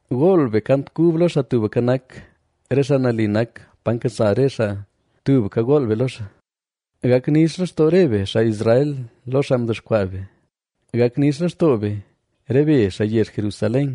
Gool be kant kub lo Xaa Tubka Nak; re xaa nali nak, pa nkasa re xaa, tubka gool be lo xaa. Gak nix lextoo re be, xaa Israel, lo xaa mdexkwaa be; gak nix lextoo be, re be xaa yezh Jerusalén,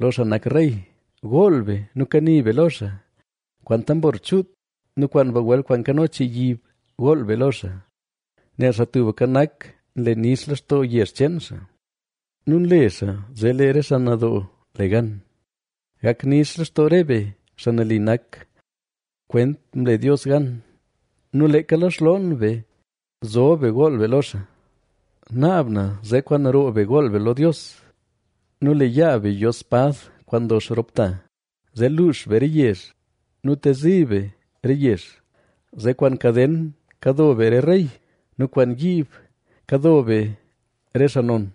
lo xaa nak Rey. Gool be nu kani be lo xaa; kwaan tambor chuut nu kwaan bagwel kwaan nkano chii yib gool be lo xaa, nel Xaa Tubka Nak, nle nix lextoo yezh cheen xaa nu nle xaa zee lee re xaa nadoo le gan. Gak nix lextoo re be, xaa nali nak, kwent mle Dios gan nu leeka lo xloon be zob be gool be lo xaa. Naab na zee kwaan roo be gool be lo Dios nu lee yaa be yo spad kwaan ndox rop ta, zee luux be re yezh nu tezi be re yezh, zee kwaan kaden kado be re rey nu kwaan yiib kado be re xaa non,